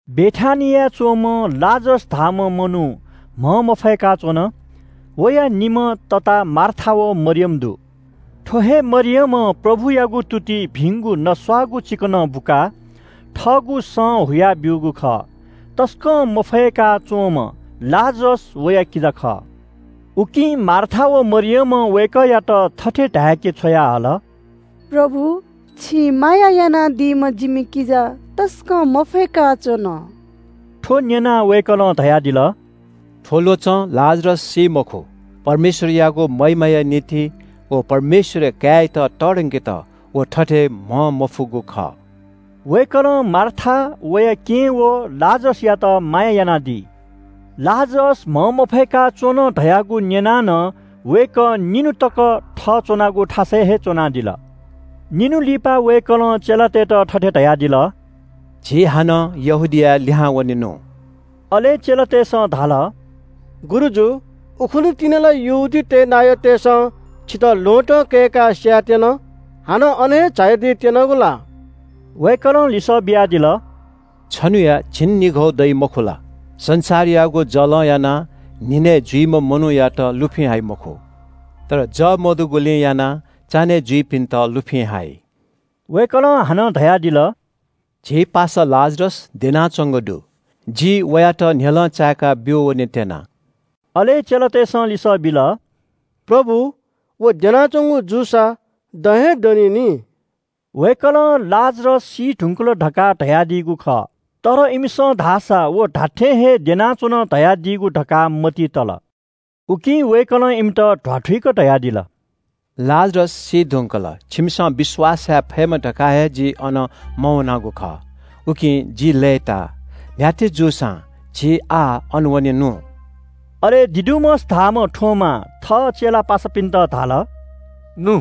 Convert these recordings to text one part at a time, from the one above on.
बेथानियाय् च्‍वंम्‍ह लाजरस धाःम्‍ह मनू म्‍हंमफय्‌का च्‍वन। वया निम्‍ह तता मार्था व मरियम दु। थ्‍व हे मरियमं प्रभुयागु तुतिइ भिंगु नस्‍वाःगु चिकनं बुकाः थःगु सं हुया ब्‍यूगु खः। तसकं मफय्‌का च्‍वंम्‍ह लाजरस वया किजा खः। उकिं मार्था व मरियमं वय्‌कःयात थथे धाय्‌के छ्वयाहल – “प्रभु, छिं माया यानादीम्‍ह जिमि किजा तसकं मफय्‌का च्‍वन।” थ्‍व न्‍यनाः वय्‌कलं धयादिल – “थ्‍व ल्‍वचं लाजरस सी मखु। परमेश्‍वरयागु महिमाया निंतिं व परमेश्‍वरया काय्‌यात तःधंकेत व थथे म्‍हंमफुगु खः।” वय्‌कलं मार्था, वया केहेँ व लाजरसयात माया यानादी। लाजरस म्‍हंमफय्‌का च्‍वन धयागु न्‍यनाः नं वय्‌कः निन्‍हु तक थः च्‍वनागु थासय् हे च्‍वनादिल। निन्‍हु लिपा वय्‌कलं चेलातय्‌त थथे धयादिल – “झी हानं यहूदियाय् लिहां वनेनु।” अले चेलातय्‌सं धाल – “गुरुजु, उखुन्‍हु तिनि ला यहूदीतय् नायःतय्‌सं छितः ल्‍वहँतं कय्‌काः स्‍यायेत्‍यन। हानं अन हे झायादी त्‍यनागु ला?” वय्‌कलं लिसः बियादिल – “छन्‍हुया झिंनिघौ दइगु मखु ला? संसारयागु जलं यानाः न्‍हिनय् जुइम्‍ह मनूयात लुफिं हाइ मखु। तर जः मदुगुलिं यानाः चान्‍हय् जुइपिन्‍त लुफिं हाइ।” वय्‌कलं हानं धयादिल – “झी पासा लाजरस द्यनाच्‍वंगु दु। जि वयात न्‍ह्यलं चाय्‌का ब्‍यू वनेत्‍यना।” अले चेलातय्‌सं लिसः बिल – “प्रभु, व द्यनाच्‍वंगु जूसा दँ हे दनी नि।” वय्‌कलं लाजरस सी धुंकल धकाः धयादीगु खः। तर इमिसं धाःसा व धात्‍थें हे द्यनाच्‍वन धयादीगु धकाः मतिइ तल। उकिं वय्‌कलं इमित ध्‍वाथुइक धयादिल – “लाजरस सी धुंकल। छिमिसं विश्‍वास याये फयेमा धकाः हे जि अन मवनागु खः, उकिं जि लय्‌ताः। न्‍ह्याथे जूसां झी आः अन वनेनु।” अले दिदुमस धाःम्‍ह थोमां थः चेला पासापिन्‍त धाल – “नु,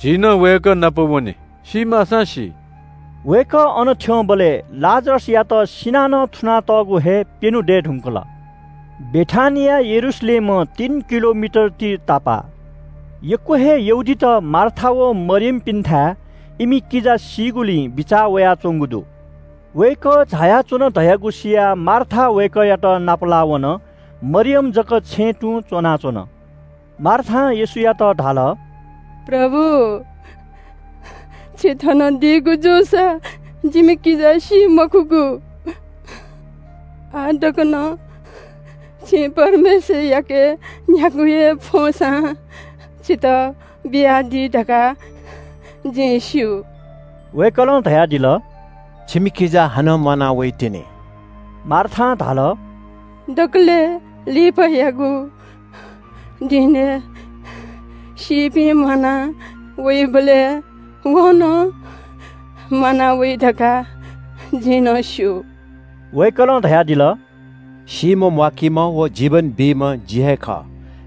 झी नं वय्‌कः नाप वने सी माःसां सी।” वय्‌कः अन थ्‍यंबलय् लाजरसयात सिनाः नं थुनातःगु हे प्‍यन्‍हु दये धुंकल। बेथानिया यरूशलेमं तीन किलोमिटर ति तापाः। यक्‍व हे यहूदीत मार्था व मरियमपिन्‍थाय् इमि किजा सीगुलिं बिचाः वयाच्‍वंगु दु। वय्‌कः झायाच्‍वन धयागु सियाः मार्था वय्‌कःयात नापलाः वन। मरियम जक छेँय् तुं च्‍वनाच्‍वन। मार्थां येशूयात धाल – “प्रभु, छि थन दीगु जूसा जिमि किजा सी मखुगु। आः तक नं छिं परमेश्‍वरयाके न्‍ह्यागु हे फ्‍वंसां छितः बियादी धकाः जिं स्‍यू।” वय्‌कलं धयादिल – “छिमि किजा हानं म्‍वाना वइतिनि।” मार्थां धाल – “दकलय् लिपायागु दिनय् सीपिं म्‍वाना वइबलय् व नं म्‍वाना वइ धकाः जिं नं स्‍यू।” वय्‌कलं धयादिल – “सीम्‍ह म्‍वाकीम्‍ह व जीवन बीम्‍ह जि हे खः।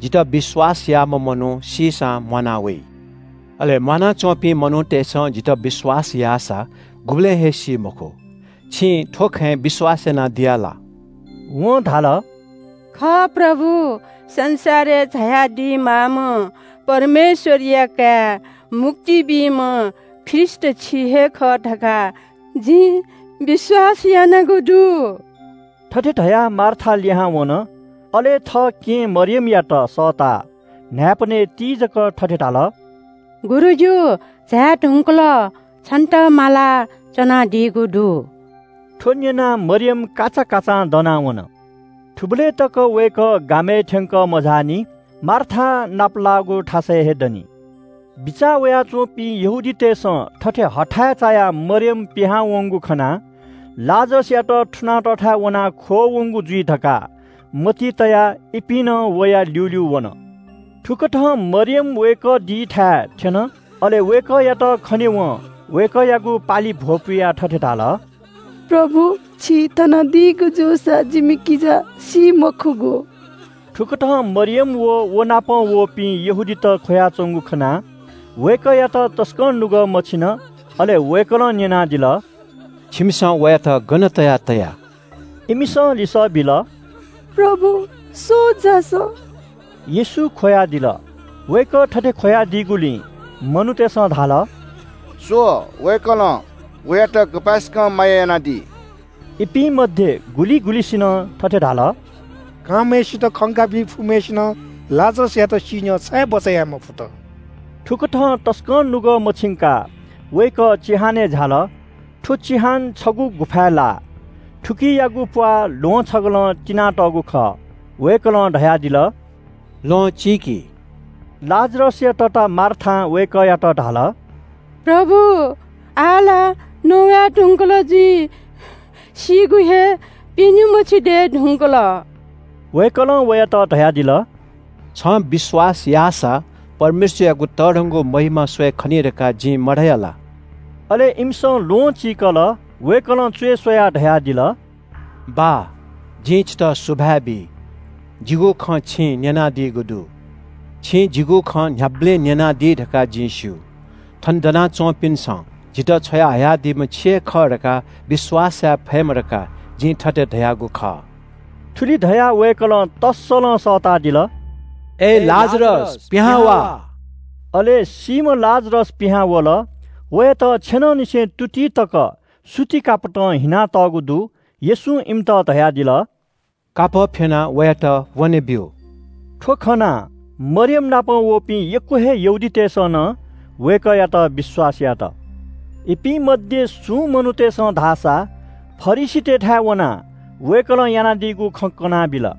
जितः विश्‍वास याःम्‍ह मनू सीसां म्‍वाना वइ। अले म्‍वानाच्‍वंपिं मनूतय्‌सं जितः विश्‍वास याःसा गुबलें हे सी मखु। छिं थ्‍व खँय् विश्‍वास यानादिया ला?” वं धाल – “खः प्रभु, संसारय् झायादी माःम्‍ह परमेश्‍वरया काय्, मुक्ति बीम्‍ह ख्रीष्‍ट छि हे खः धकाः जिं विश्‍वास यानागु दु।” थथे धयाः मार्था लिहां वन। अले थः केहेँ मरियमयात सःताः न्‍हाय्‌पनय् तीजक थथे धाल – “गुरुजु झाये धुंकल, छन्‍त माला च्‍वनादीगु दु।” थ्‍व न्‍यनाः मरियम काचाकाचां दनाः वन। थुबलय् तक वय्‌कः गामय् थ्‍यंकः मझाःनि, मार्थां नापलाःगु थासय् हे दनि। बिचाः वयाच्‍वंपिं यहूदीतय्‌सं थथे हथाय् चायाः मरियम पिहां वंगु खनाः लाजरसयात थुनातःथाय् वनाः ख्‍वः वंगु जुइ धकाः मतिइ तयाः इपिं नं वया ल्‍यूल्‍यू वन। थुकथं मरियम वय्‌कः दीथाय् थ्‍यन, अले वय्‌कःयात खनेवं वय्‌कःयागु पालिइ भ्‍वपुयाः थथे धाल – “प्रभु, छि थन दीगु जूसा जिमि किजा सी मखुगु।” थुकथं मरियम अले व नाप वःपिं यहूदीत ख्‍वयाच्‍वंगु खनाः वय्‌कःयात तसकं नुगः मछिन। अले वय्‌कलं न्‍यनादिल – “छिमिसं वयात गन तयाः तया?” इमिसं लिसः बिल – “प्रभु, स्‍वः झासँ।” येशू ख्‍वयादिल। वय्‌कः थथे ख्‍वयादीगुलिं मनूतय्‌सं धाल – “स्‍व, वय्‌कलं वयात गपाय्‌सकं माया यानादी।” इपिं मध्‍ये गुलिं गुलिंसिनं थथे धाल – “कांम्‍हय्‌सित खंकाबी फुम्‍हय्‌सिनं लाजरसयात सी न्‍ह्यः छाय् बचय् याये मफुत?” थुकथं तसकं नुगः मछिंकाः वय्‌कः चिहानय् झाल। थ्‍व चिहान छगू गुफाय् लाः। थुकियागु प्‍वाः ल्‍वहं छगलं तिनातःगु खः। वय्‌कलं धयादिल – “ल्‍वहं चीकि।” लाजरसया तता मार्थां वय्‌कःयात धाल – “प्रभु, आः ला नवये धुंकल जुइ, सीगु हे प्‍यन्‍हु मछि दये धुंकल।” वय्‌कलं वयात धयादिल – “छिं विश्‍वास यानादीसा, परमेश्‍वरयागु तःधंगु महिमा स्‍वये खनी धकाः जिं मधया ला?” अले इमिसं ल्‍वहं चीकल। वय्‌कलं च्‍वय् स्‍वयाः धयादिल – “बाः, जिं छितः सुभाय् बी। जिगु खँ छिं न्‍यनादीगु दु। छिं जिगु खँ न्‍ह्याबलें न्‍यनादी धकाः जिं स्‍यू। थन दना च्‍वंपिन्‍सं जितः छ्वयाहयादीम्‍ह छि हे खः धकाः विश्‍वास याये फयेमा धकाः जिं थथे धयागु खः।” थुलि धयाः वय्‌कलं तस्‍सलं सःतादिल – “अय् लाजरस, पिहां वा।” अले सीम्‍ह लाजरस पिहां वल। वयात छेनंनिसें तुतिइ तक सुति कापतं हिनातःगु दु। येशूं इमित धयादिल – “कापः फ्‍यनाः वयात वनेब्‍यु।” थ्‍व खनाः मरियमनापं वःपिं यक्‍व हे यहूदीतय्‌सं नं वय्‌कःयात विश्‍वास यात। इपिं मध्‍ये सुं मनूतय्‌सं धाःसा फरिसीतय्‌थाय् वनाः वय्‌कलं यानादीगु खँ कनाबिल।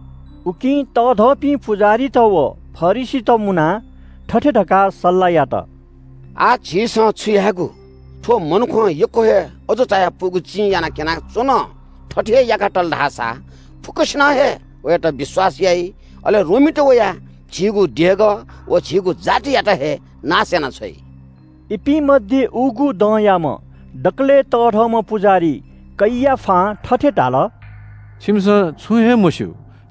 उकिं तःधंपिं पुजाहारीत व फरिसीत मुनाः थथे धकाः सल्‍लाह यात– “आः झीसं छु यायेगु? थ्‍व मनुखं यक्‍व हे अजू चायापुगु चिं यानाः क्‍यनाच्‍वन। थथे हे याका तल धाःसा फुक्‍कसिनं हे वयात विश्‍वास याइ। अले रोमीत वयाः झीगु देगः व झीगु जातियात हे नाश यानाछ्वइ।” इपिं मध्‍ये उगु दँयाम्‍ह दकलय् तःधंम्‍ह पुजाहारी कैयाफां थथे धाल – “छिमिसं छुं हे मस्‍यू।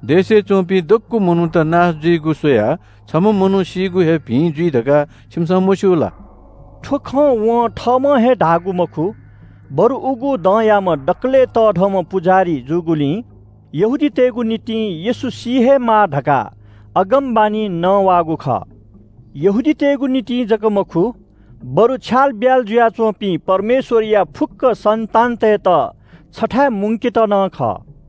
देशय् च्‍वंपिं दक्‍व मनूत नाश जुइगु स्‍वयाः छम्‍ह मनू सीगु हे भिं जुइ धकाः छिमिसं मस्‍यू ला?” थ्‍व खँ वं थःम्‍हं हे धाःगु मखु, बरु उगु दँयाम्‍ह दकलय् तःधंम्‍ह पुजाहारी जूगुलिं यहूदीतय्‌गु निंतिं येशू सी हे माः धकाः अगमवाणी नवाःगु खः। यहूदीतय्‌गु निंतिं जक मखु, बरु छ्यालब्‍याल जुयाच्‍वंपिं परमेश्‍वरया फुक्‍क सन्‍तानतय्‌त छथाय् मुंकेत नं खः।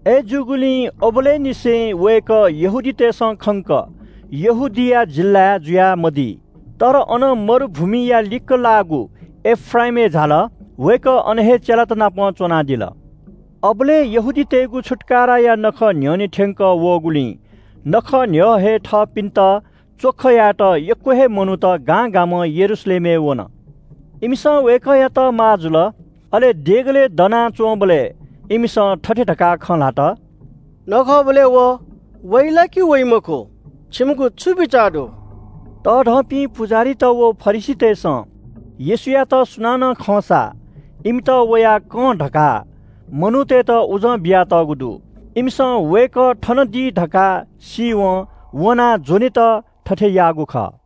अय्‌जूगुलिं अबलय् निसें वय्‌कः यहूदीतय्‌सं खंक यहूदिया जिल्‍लाय् जुया मदी। तर अनं मरुभूमिया लिक्‍क लाःगु एफ्राइमय् झाल। वय्‌कः अन हे चेलात नाप च्‍वनादिल। अबलय् यहूदीतय्‌गु छुत्‍काराया नखः न्‍ह्यःने थ्‍यंकः वःगुलिं नखः न्‍ह्यः हे थःथपिन्‍त च्‍वख यायेत यक्‍व हे मनूत गां गामं यरूशलेमय् वन। इमिसं वय्‌कःयात माः जुल। अले देगलय् दनाच्‍वंबलय् इमिसं थथे धकाः खँ ल्‍हात– “नखःबलय् व वइ ला कि वइ मखु, छिमिगु छु बिचाः दु?” तःधंपिं पुजाहारीत व फरिसीतय्‌सं येशूयात सुनानं खंसा इमित वयाः कं धकाः मनूतय्‌त उजं बियातःगु दु। इमिसं वय्‌कः थन दी धकाः सीवं वनाः ज्‍वनेत थथे याःगु खः।